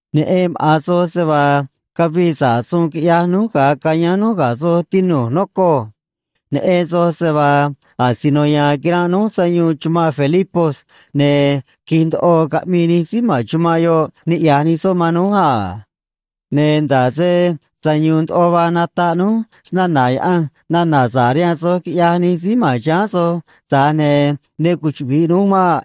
Neꞌen maꞌa̱n soj se vaa cavii sa̱ꞌ suun quiꞌyaj núj ga̱a cayáán núj ga̱ soj, tinu̱j, nocoj. Neꞌen soj se vaa asino ya̱a̱n quiranꞌ núj sayuun chumanꞌ Filipos, ne̱ qui̱j ndoꞌo caꞌmii nij síí ma̱n chumanꞌ yoꞌ niꞌya̱j nij soꞌ man núj a. Ne̱ nda̱ꞌ se sayu̱u̱n ndoꞌo vaa nataꞌ núj snana̱ Yaꞌanj nana̱ sa̱ꞌ rihaan soj quiꞌyaj nij síí ma̱n chiháán soj, tza̱j ne̱ ne cuchuꞌvi̱ꞌ núj maꞌ.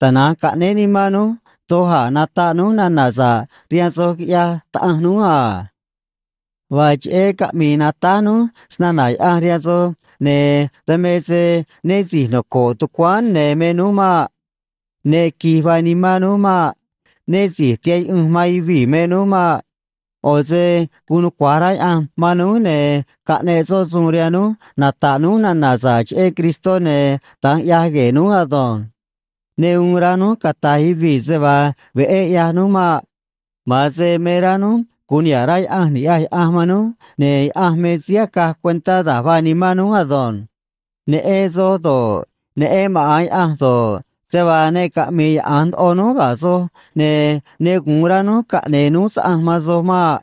Tana̱nj caꞌnéé nimán núj doj a̱ nata̱ꞌ núj nana̱ sa̱ꞌ rihaan soj, quiꞌyaj Taꞌanj núj a. Vaa cheꞌé caꞌmii natáj núj snana̱ Yaꞌanj rihaan soj, ne̱ dan me se né si̱j noco̱ꞌ tucuáán ne̱ me núj maꞌ. Ne qui̱j vaa nimán núj maꞌ. Né si̱j tihaꞌ yuꞌunj man yuvii̱ me núj maꞌ. ꞌO̱ se guun nucua̱j rá Yaꞌanj man núj, ne̱ caꞌneꞌ soꞌ suun rihaan núj nata̱ꞌ núj nana̱ sa̱ꞌ cheꞌé Cristó, ne̱ da̱nj ꞌyaj gue̱e̱ núj ado̱nj. Ne uun rá núj cata̱j yuvii̱ se vaa veꞌé ꞌyaj núj maꞌ. Ma̱an se me rá núj gu̱un niha̱ꞌ rá Yaꞌanj ni̱ꞌyaj Yaꞌanj man núj, ne̱ Yaꞌanj me síí acaj cuentá da̱j vaa nimán núj ado̱nj. Neꞌen soj do̱ꞌ, neꞌen maꞌa̱n Yaꞌanj do̱ꞌ, se vaa ne caꞌmi̱i̱ yaꞌa̱nj ndoꞌo núj ga̱ soj, ne̱ ne gu̱un rá núj caꞌne̱e̱ núj saꞌanj man soj maꞌ.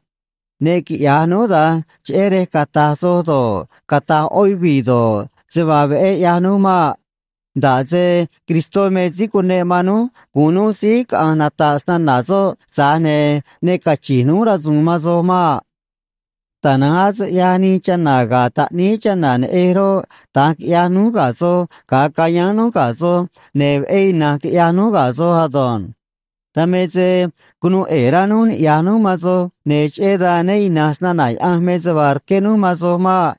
Ne quiꞌya̱j núj da̱nj cheꞌé rej cata̱j soj do̱ꞌ, cata̱j ꞌó yuvii̱ do̱ꞌ, se vaa veꞌé ꞌyaj núj maꞌ. Nda̱ꞌ se Cristó me síí cuneꞌ man núj gu̱un núj síí caꞌa̱nj nata̱ꞌ snana̱ soꞌ, tza̱j ne̱ ne cachi̱nj núj rasu̱u̱n man soj maꞌ. Tana̱nj ase ꞌyaj nij chana̱ ga̱ taꞌníí chana̱ neꞌej roꞌ, da̱nj quiꞌyaj núj ga̱ soj ga̱a cayáán núj ga̱ soj, ne̱ veꞌé ina̱nj quiꞌyaj núj ga̱ soj ado̱nj. Dan me se cunuu ꞌe̱e̱ rá núj niꞌya̱j núj man soj, ne̱ cheꞌé dan né ina̱nj snana̱ Yaꞌanj me se vaa rqué núj man soj maꞌ.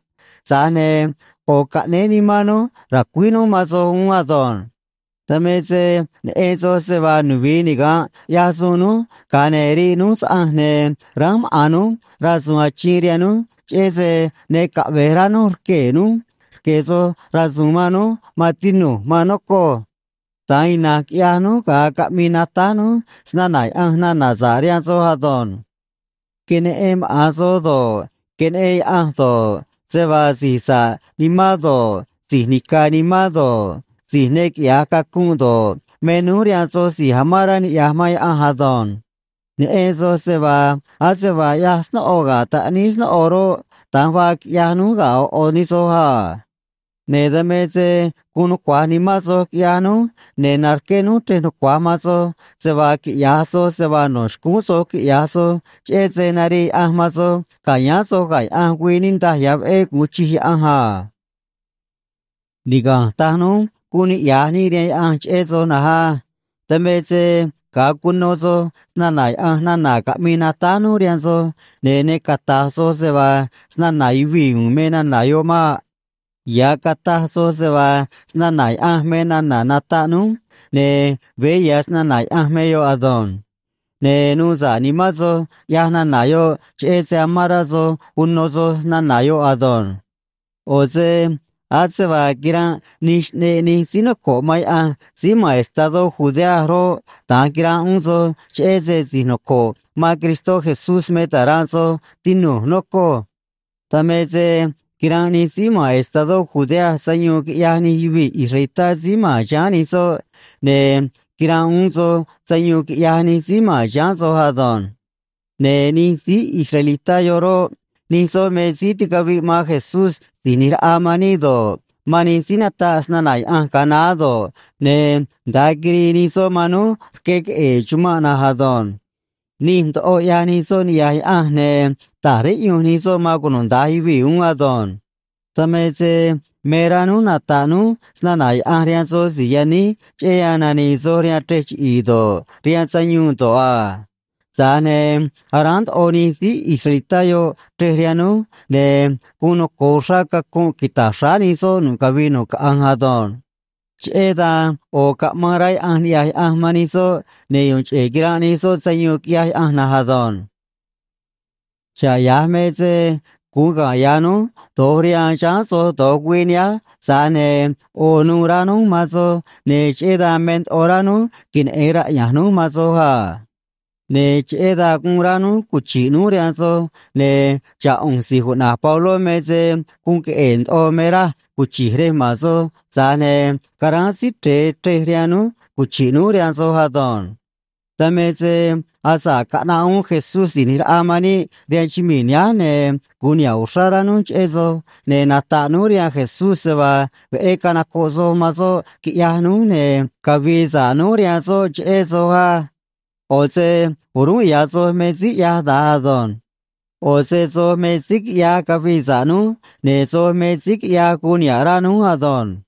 Tza̱j ne̱ ꞌo̱ caꞌnéé nimán núj ra̱cuíj núj man soj uún ado̱nj. Dan me se neꞌen soj se vaa nuvi̱i niga̱nꞌ ꞌyaj suun núj, ga̱a ne̱ riꞌ núj saꞌanj, ne̱ ránj maꞌa̱n núj rasu̱u̱n achiin rihaan núj, cheꞌé se ne caꞌve̱j rá núj rquee̱ núj rque̱ soj rasu̱u̱n man núj, maan tinu̱j, maan nocoj. Da̱nj ina̱nj quiꞌyaj núj ga̱a caꞌmii natáj núj snana̱ Yaꞌanj nana̱ sa̱ꞌ rihaan soj ado̱nj. Queneꞌen maꞌa̱n soj do̱ꞌ, queneꞌen Yaꞌanj do̱ꞌ, se vaa si̱j sa̱ꞌ nimán do̱ꞌ, si̱j nica̱ nimán do̱ꞌ, si̱j ne quiꞌya̱j cacunꞌ do̱ꞌ, me núj rihaan soj si̱j amán rá niꞌya̱j man Yaꞌanj ado̱nj. Neꞌen soj se vaa ase vaa ꞌyaj snóꞌo ga̱ taꞌníí snóꞌo roꞌ, da̱nj vaa quiꞌyaj núj ga̱ ꞌo̱ ꞌo̱ nij soj a. Ne̱ dan me se guun nucua̱j nimán soj, quiꞌyaj núj, ne̱ narqué núj chrej nucua̱j man soj se vaa quiꞌya̱j soj se vaa no̱ xcúún soj quiꞌya̱j soj cheꞌé se narii Yaꞌanj man soj ca̱yáán soj ga̱ Yaꞌanj güii niꞌndaj ya̱ veꞌé gu̱un chij Yaꞌanj a. Niga̱nj taj núj guun niꞌya̱j níꞌ rihaan Yaꞌanj cheꞌé soj na̱nj á. Dan me se ga̱a cuno soj snana̱ Yaꞌanj nana̱ caꞌmii natáj núj rihaan soj, ne̱ ne cata̱j soj se vaa snana̱ yuvii̱ u̱u̱n me nana̱ yoꞌ maꞌ. Ya̱ cataj soj se vaa snana̱ Yaꞌanj me nana̱ nataꞌ núj, ne̱ veé ya̱ snana̱ Yaꞌanj me yoꞌ ado̱nj. Ne̱ nuu sa̱ꞌ nimán soj, ꞌyaj nana̱ yoꞌ, cheꞌé se amán rá soj uno soj nana̱ yoꞌ ado̱nj. ꞌO̱ se ase vaa quiranꞌ nij xꞌneꞌ nij síí noco̱ꞌ man Yaꞌanj síí ma̱n estadó Judea roꞌ, da̱nj quiranꞌ uún soj, cheꞌé se si̱j noco̱ꞌ man Cristó Jesús me ta̱ranꞌ soj, tinu̱j, nocoj. Dan me se quiranꞌ nij síí ma̱n estadó Judea sayuun, quiꞌyaj nij yuvii̱ israelitá síí ma̱n chiháán nij soꞌ, ne̱ quiranꞌ uún soj sayuun, quiꞌyaj nij síí ma̱n chiháán soj ado̱nj. Ne̱ nij síí israelitá yoꞌ roꞌ, nij soꞌ me síí ticaviꞌ man Jesús Si̱j ꞌNi̱j Raꞌa man níꞌ do̱ꞌ, man nij síí nataꞌ snana̱ Yaꞌanj ga̱a naá do̱ꞌ, ne̱ nda̱a quirii nij soꞌ man núj rque queꞌe̱e̱ chumanꞌ na̱nj ado̱nj. Nij ndoꞌo ꞌyaj nij soꞌ niꞌya̱j Yaꞌanj, ne̱ ta̱j riꞌyunj nij soꞌ man cunuda̱nj yuvii̱ uún ado̱nj. Dan me se me rá núj nata̱ꞌ núj snana̱ Yaꞌanj rihaan soj si̱j yaníj cheꞌé yan nani̱i̱ soj rihaan chrej chiꞌi̱i̱ do̱ꞌ, rihaan sayuun do̱ꞌ a. Tza̱j ne̱ aráán ndoꞌo nij síí israelitá yoꞌ chrej rihaan núj, ne̱ guun noco̱o uxrá cacunꞌ quita̱j xráá nij soꞌ nu̱ꞌ cavii nu̱ꞌ caꞌanj ado̱nj. Cheꞌé dan ꞌo̱ caꞌmaan rá Yaꞌanj niꞌya̱j Yaꞌanj man nij soꞌ, ne̱ yu̱u̱n cheꞌe̱ quiranꞌ nij soꞌ sayuun, quiꞌyaj Yaꞌanj na̱nj ado̱nj. Xa̱ꞌ ya̱j me se guun ga̱nꞌ ya̱ núj do̱j rihaan chiháán soj do̱j güii nihánj, tza̱j ne̱ ꞌo̱ nuû rá núj man soj, ne̱ cheꞌé dan me ndoꞌo rá núj queneꞌe̱n raꞌya̱nj núj man soj a. Ne̱ cheꞌé dan guun rá núj cuchi̱ꞌ núj rihaan soj, ne̱ xa̱ꞌ ꞌu̱nj si̱j cuꞌna̱j Pabló me se guun queꞌe̱e̱ ndoꞌo me raj cuchi̱j rej ma̱n soj, tza̱j ne̱ caráán Síí Chre̱e chrej rihaan núj cuchi̱ꞌ núj rihaan soj ado̱nj. Dan me se asa̱ꞌ caꞌnaꞌ uún Jesús Si̱j ꞌNi̱j Raꞌa man níꞌ rihaan chumii̱ nihánj ne̱ gu̱un niha̱ꞌ uxrá rá núj cheꞌé soj, ne̱ nata̱ꞌ núj rihaan Jesús se vaa veꞌé canocoꞌ soj man soꞌ quiꞌyaj núj, ne̱ cavi̱i̱ sa̱ꞌ núj rihaan soꞌ cheꞌé soj á. ꞌO̱ se o̱rúnꞌ ya̱ soj me síí ꞌyaj da̱nj ado̱nj. ꞌO̱ se soj me síí quiꞌyaj cavii sa̱ꞌ núj, ne̱ soj me síí quiꞌyaj guun niha̱ꞌ rá núj ado̱nj.